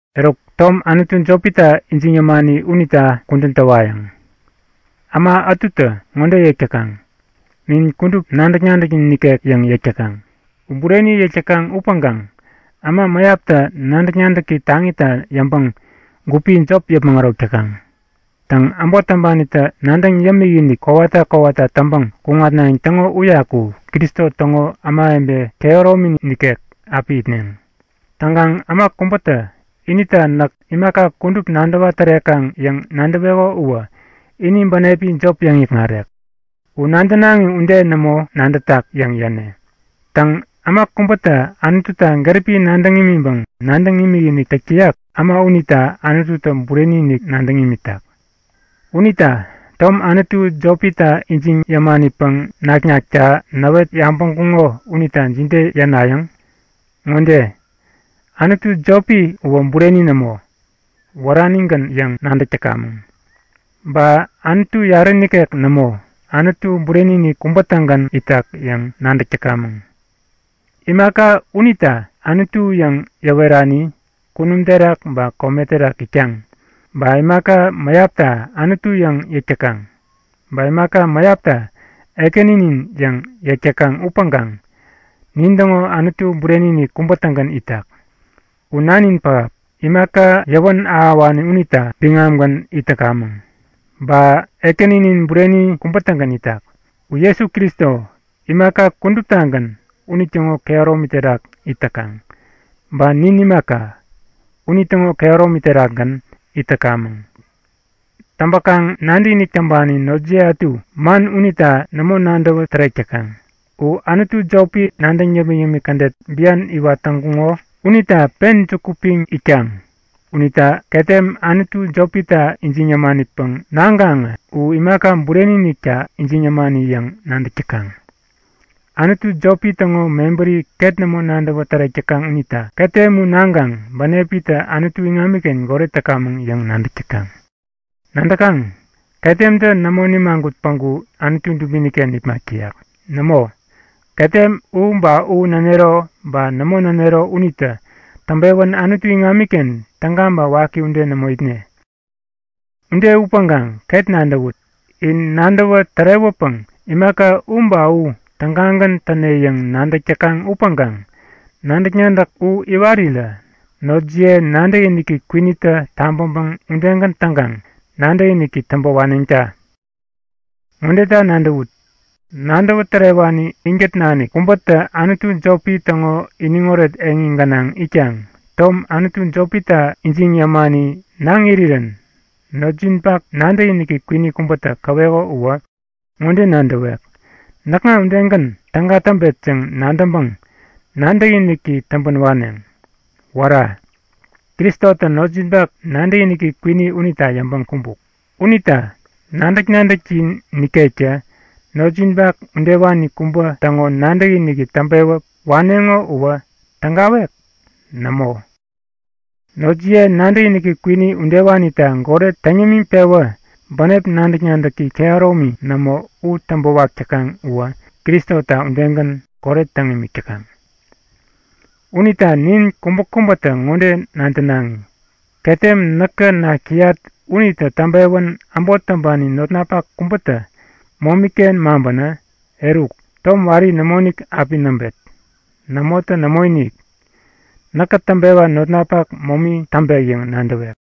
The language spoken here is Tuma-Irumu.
Eruk, tom anutu jopita ijiŋ yämani unita kudän täwayäŋ. Äma ätutä ŋode yäk täkaŋ; Nin kudup nadäk-nadäknin ikek yäŋ yäk täkaŋ. U bureni yäk täkaŋ upäŋkaŋ äma mäyaptä nadäk-nadäki taŋita yäŋpäŋ gupi jop yäpmäŋ ärok täkaŋ. Täŋ, äbot täŋpanitä nadäŋ yämikinik kowata kowata täŋpäŋ kuŋatnayäŋ täŋo uyaku Kristo täŋo ämawebe kehäromini nikek api itneŋ. Täŋkaŋ äma kubätä inita näk imaka kudup nadäwa tärekaŋ yäŋ nadäweko uwä ini bänepi jop yäŋ-ikŋarek. U nadänaŋi ude nämo nadätak yäŋ yäne! Täŋ, äma kubätä Anututa gäripi nadäŋ imiŋpäŋ nadäŋ imikinik täk täyak, äma unita Anututä bureni-inik nadäŋ imitak. Unita tom anutu jopita ijiŋ yämanipäŋ naknakta näwet yabäŋkuŋo unita jide yänayäŋ? Ŋode; Anutu jopi uwä bureni nämo, wäranigän yäŋ nadäk täkamäŋ. Ba Anutu yarä nikek nämo, Anutu bureni-inik kubä-tägän itak yäŋ nadäk täkamäŋ. Imaka unita anutu yäŋ yäwerani kunum terak ba kome terak itkaŋ, ba imaka mäyapta anutu yäŋ yäk täkaŋ, ba imaka mäyapta ekäninin yäŋ yäk täkaŋ upäŋkaŋ nintäŋo Anutu bureni-inik kubä-tägän itak. U Nanin pähap, imaka yäwän ahäwani unita biŋamgän it täkamäŋ. Ba Ekäninin bureni kubä-tägän itak. U Jesu Kristo, imaka kuduptagän unitäŋo kehäromi terakgän it täkaŋ, ba nin imaka, unitäŋo kehäromi terakgän it täkamäŋ. Täŋpäkaŋ nadäkinik täŋpani notjiye ätu man unita nämo nadäwä tärek täkaŋ. U anutu jopi nadäŋ yämik-yämik kädet bian iwat täŋkuŋo unita pen juku piŋ itkaŋ unita ketem anutu jopita ijiŋ yämanipäŋ naŋkaŋä u imaka bureni-inikta ijiŋ yämani yäŋ nadäk täkaŋ. Anutu jopi täŋo mebäri ket nämo nadäwä tärek täkaŋ unita ketem u naŋkaŋ bänepitä Anutu iŋamiken goret täkamäŋ yäŋ nadäk täkaŋ. Nadäkaŋ? Ketemtä nämo nimagut päŋku Anutu dubini-ken nipmak täyak. Nämo, ketem u ba u nänero ba nämo nänero unitä täŋpewän Anutu iŋamiken täga ba waki ude nämo itne. Ude upäŋkaŋ ket nadäwut. In nadäwä tärewäpäŋ imaka u ba u tägagän täne yäŋ nadäk täkaŋ upäŋkaŋ nadäk-nadäk u iwarirä notjiye nadäkiniki kwinitä tabäŋpäŋ udegän täŋkaŋ nadäkiniki täŋpä waneŋta! Ŋodeta nadäwut; Nadäwä tärewani inkät nanik kubätä anutu jopi täŋo iniŋoret eŋi gänaŋ itkaŋ tom anutu jopita ijiŋ yämani naŋ irirän notjinpak nadäkiniki kwini kubätä käweko uwä ŋode nadäwek; Näkŋa udegän täga täŋpet yäŋ nadäŋpäŋ nadäkiniki täŋpän waneŋ. Wära! Kristotä notjinpak nadäkiniki kwini unita yäŋpäŋ kumbuk. Unita nadäk-nadäkjin nikektä notjinpak udewani kubä täŋo nadäkiniki täŋpewä waneŋo uwä tägawek? Nämo! Notjiye nadäkiniki kwini udewanita goret täŋ yämiŋpewä bänep nadäk-nadäki kehäromi nämo u täŋpäwak täkaŋ uwä Kristota udegän goret täŋ imik täkaŋ. Unita nin kubäkubätä ŋode nadänaŋi; Ketem näkä nak täyat unitä täŋpewän äbot täŋpani notnapak kubätä momi-ken maŋpänä eruk, tom wari nämoinik api näŋpet. Nämotä nämoinik, näkä täŋpewa notnapak momi täŋpek yäŋ nadäwet.